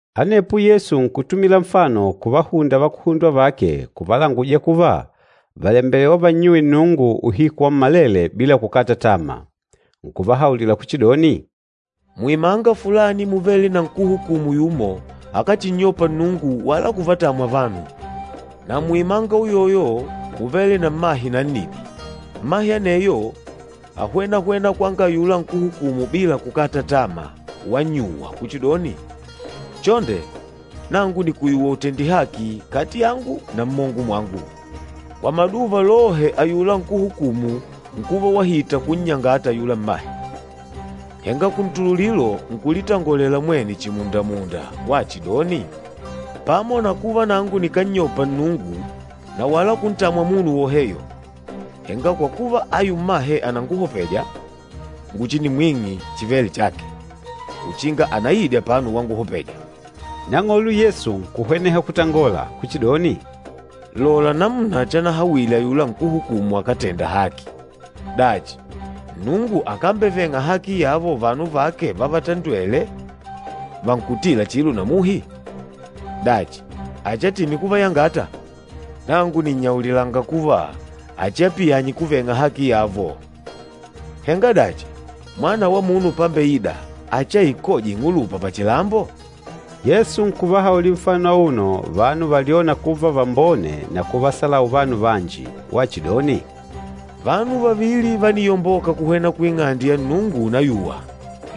Anepo Yesu nkutumila nfano kuvahunda vakuhundwa vake kuvalanguja kuva vàlembelewa vannyuwe Nnungu uhiku wammalele bila kukata tama. Nkuvahaulila kuchidoni, “Muimanga fulani múvele na nkúhukumu yumo akáchinnyopa Nnungu wala kuvatamwa vanu. Na muimanga uyoyo múvele na mmahe nannidi. Mmahe aneyo áhwena-hwena kwanga ayula nkúhukumu bila kukata tama wannyuwa kuchidoni, ‘Chonde nangu nìkuyuwa utende haki kati yangu na mmongo mwangu.’ Kwa maduva lohe ayula nkúhukumu nkuva wahita kunnyangata ayula mmahe, henga kuntululilo nkulitangolela mwene chimunda-munda wachidoni, ‘Pamo na kuva nangu nikánnyopa Nnungu na wala kuntamwa munu woheyo, henga kwa kuva ayu mmahe ànanguhopeja, nguchinimwing'e chivêle chake, uchinga anaide apano wanguhopeja!’” Nang'olo Yesu nkuhweneha kutangola kuchidoni, “Lola namuna chanahawile ayula nkúhukumu akátenda haki. Dachi, Nnungu akambeveng'a haki yavo vanu vake vavatandwêle, vankutîla chilo na muhi? Dachi, achiatime kuvayangata? Nangu nìnnyaulilanga kuva, achiapiyanye kuveng'a haki yavo. Henga dachi, Mwana wa Munu pambeida achiaikoje ing'ulupa pachilambo?” Yesu nkuvahaulila auno nfano vanu valyôna kuva vambone na kuvahebula vanu vanji, wachidoni, “Vanu vavili vániyomboka kuhwena ku Ing'ande ya Nnungu unayuwa,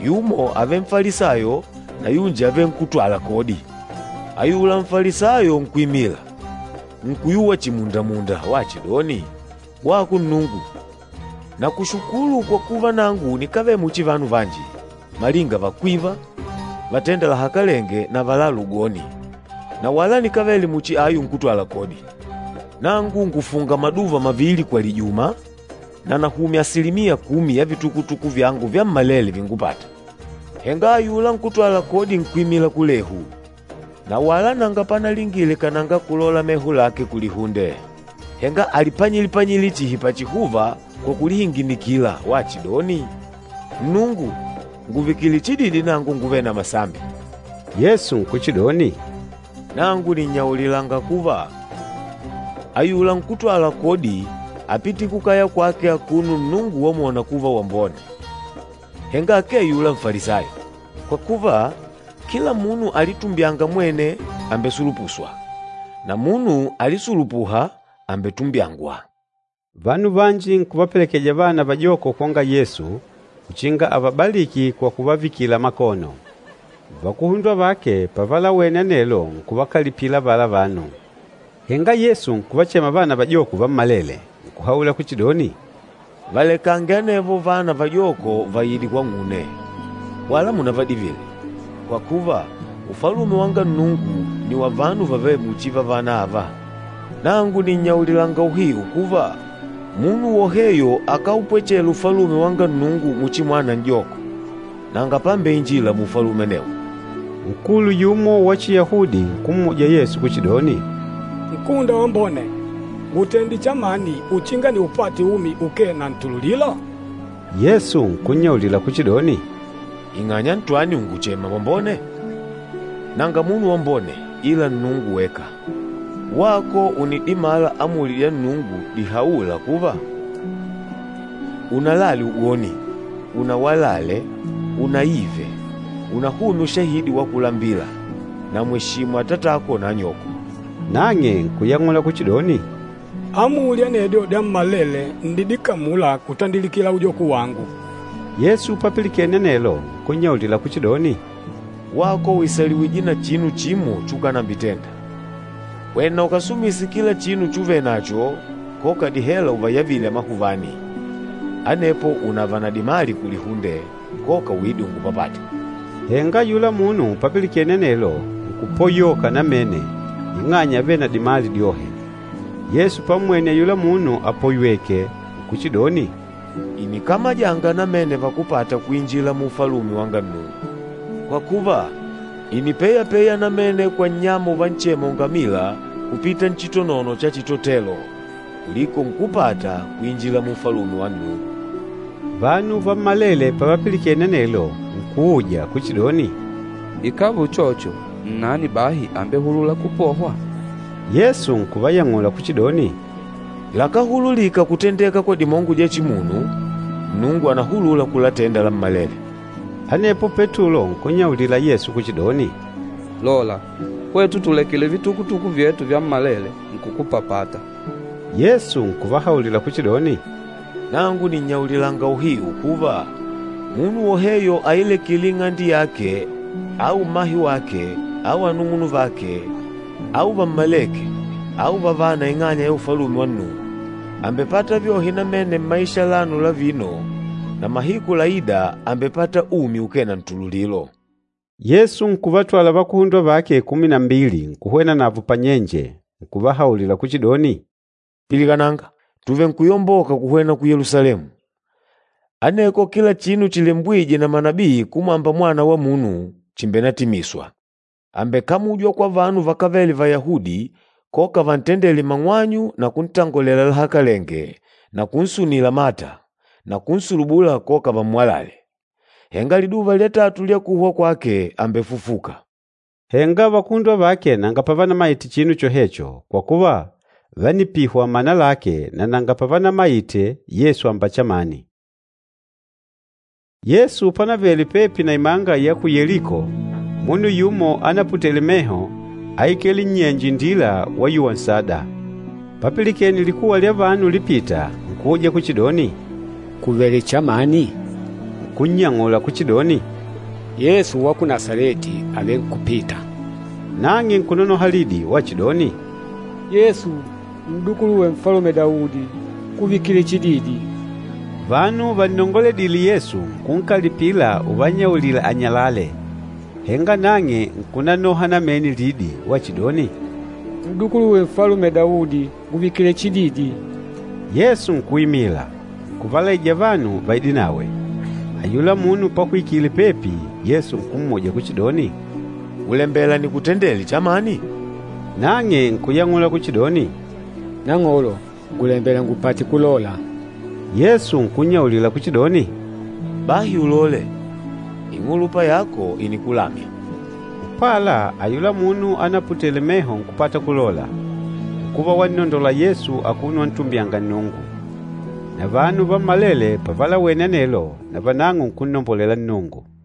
yumo ávele Nfalisayo na yunji ávele nkútwala kodi. Ayula Nfalisayo nkuimila, nkuyuwa chimundamunda wachidoni, ‘Wako Nnungu, nakushukulu kwa kuva nangu nikávele muchi vanu vanji, malinga vakwiva, vatênda lahakalenge na valâla ugoni, na wala nikávele muchi ayu nkútwala kodi. Nangu ngùfunga maduva mavili kwa lijuma, na nahumya asilimiya kumi ya vitukutuku vyangu vyammalele víngupàtà.’ Henga ayula nkútwala kodi nkuimila kulehu, na wala nanga panalingile kananga kulola meho lake kulihunde, henga alipanyile-panyile chihi pachihuva kwa kulihinginikila wachidoni, ‘Nnungu, ngùvikile chididi nangu nguvêle na masambi!’” Yesu nkuchidoni, “Nangu nìnnyaulilanga kuva, ayula nkútwala kodi ápite kukaya kwake akuno Nnungu wamwona kuva wambone, henga akee ayula Nfalisayo. Kwa kuva, kila munu alitumbyânga mwene, àmbesulupuswa, na munu alisulupûha, àmbetumbyangwa.” Vanu vanji nkuvapelekeja vana vajoko kwanga Yesu uchinga avabaliki kwa kuvavikila makono. Vakuhundwa vake pavalawene anelo nkuvakalipila avala vanu. Henga Yesu nkuvachema vana vajoko vammwenele, nkuhaula kuchidoni, “Valekange anevo vana vajoko vaide kwang'une, wala munavadivile, kwa kuva, Ufalume wanga Nnungu nni wa vanu vavêle muchi vavana ava. Nangu nìnnyaulilanga uhiu kuva, munu woheyo akáupwechela Ufalume wanga Nnungu muchi mwana n'joko, nanga pambeinjila mu Ufalume anewo.” Nkulu yumo wa Chiyahudi nkummuja Yesu kuchidoni, “Nkúhunda wambone, ngutende chamani uchinga niupate umi ukee na ntululilo?” Yesu nkunnyaulila kuchidoni, “Ing'anya ntwani ùnguchema wambone? Nanga munu wambone ila Nnungu weka. Wako ùnidimala amuli dya Nnungu dihaûla kuva, ‘Unalale ugoni, unawalale, unaive, unahumye ushahidi wa kulambila na mweshimu atatako na anyoko.’” Nang'e nkuyang'ula kuchidoni, “Amuli anedyo dyammalele ǹnidikamula kutandikila ujoko wangu.” Yesu papilikene anelo nkunnyaulila kuchidoni, “Wako ùisaliwije na chinu chimo chukanambitenda. Hwena ukasumise kila chinu chuvenacho, koka dihela uvayavile amahuvani, anepo unava na dimali kulihunde, koka uide ungupapate.” Henga ayula munu papilikene anelo, nkupoyoka namene ing'anya ávele na dimali dyohe. Yesu pammwene ayula munu apoyweke nkuchidoni, “Ìnikamajanga namene vakúpata kuinjila mu Ufalume wanga Nnungu! Kwa kuva, ìnipeyepeya namene kwa nnyama uvanchema ungamila kupita nchitonono cha chitotelo kuliko nkúpata kuinjila mu Ufalume wa Nnungu.” Vanu vammalele pavapilikene anelo nkuuja kuchidoni, “Ikàva uchocho, nnani bahi ambehulûla kupohwa?” Yesu nkuvayang'ula kuchidoni, “Lakáhululika kutendeka kwa dimongo dya chimunu, Nnungu ànahulula kulatenda lammalele.” Anepo Petulo nkunnyaulila Yesu kuchidoni, “Lola, hwetu tùlekile vitukutuku vyetu vyammalele nkukupapata!” Yesu nkuvahaulila kuchidoni, “Nangu nìnnyaulilanga uhiu kuva, munu woheyo ailekîle ing'ande yake au mmahe wake au anung'unuvake au vammalêke au vavana ing'anya ya Ufalume wa Nnungu, àmbepata vyohe namene mmaisha alano la vino, na mahiku laîda àmbepata umi ukee na ntululilo.” Yesu nkuvatwala vakuhundwa vake kumi na mbili nkuhwena navo pannyenje, nkuvahaulila kuchidoni, “Pilikananga! Tuvenkuyomboka kuhwena ku Yelusalemu, aneko kila chinu chilembwîje na manabii kumwamba Mwana wa Munu chimbenatimiswa. Ambekamujwa kwa vanu vakávele Vayahudi koka vantendele mang'wanyu na kuntangolela lahakalenge na kunsunila mata, na kunsulubula koka vammwalale, henga liduva lya tatu lya kuhwa kwake ambefufuka.” Henga vakuhundwa vake nanga pavanamaite chinu chohecho, kwa kuva, vánipihwa mana lake na nanga pavanamayite Yesu amba chamani. Yesu pánavele pepi na imanga ya ku Yeliko, munu yumo anaputêle meho áikele nnyenje indila wayuwa nsada. Papilikene likuwa lya vanu ulipita nkuuja kuchidoni, “Kùvele chamani?” Nkunnyang'ula, kuchidoni, “Yesu wa ku Nasaleti àvenkupita.” Nang'e nkunonoha lidi wachidoni, “Yesu, n'dukuluwe Nfalume Daudi, ngùvikile chididi!” Vanu vannongoledîle Yesu nkunkalipila uvannyaulila anyalale, henga nang'e nkunanoha namene lidi wachidoni, “N'dukuluwe Nfalume Daudi, ngùvikile chididi!” Yesu nkuimila, nkuvalaija vanu vaidenawe. Ayula munu pahwikile pepi, Yesu nkummuja kuchidoni, “Ùlembela nikutendele chamani?” Nang'e nkuyang'ula kuchidoni, “Nang'olo, ngùlembela ngupate kulola.” Yesu nkunnyaulila kuchidoni, “Bahi uloole! Ing'ulupa yako ìnikulamya.” Upala ayula munu anaputele meho nkupata kulola, nkuva wannondola Yesu akuno wantumbyanga Nnungu. Na vanu vammalele pavalawene anelo, navanang'o nkunnombolela Nnungu.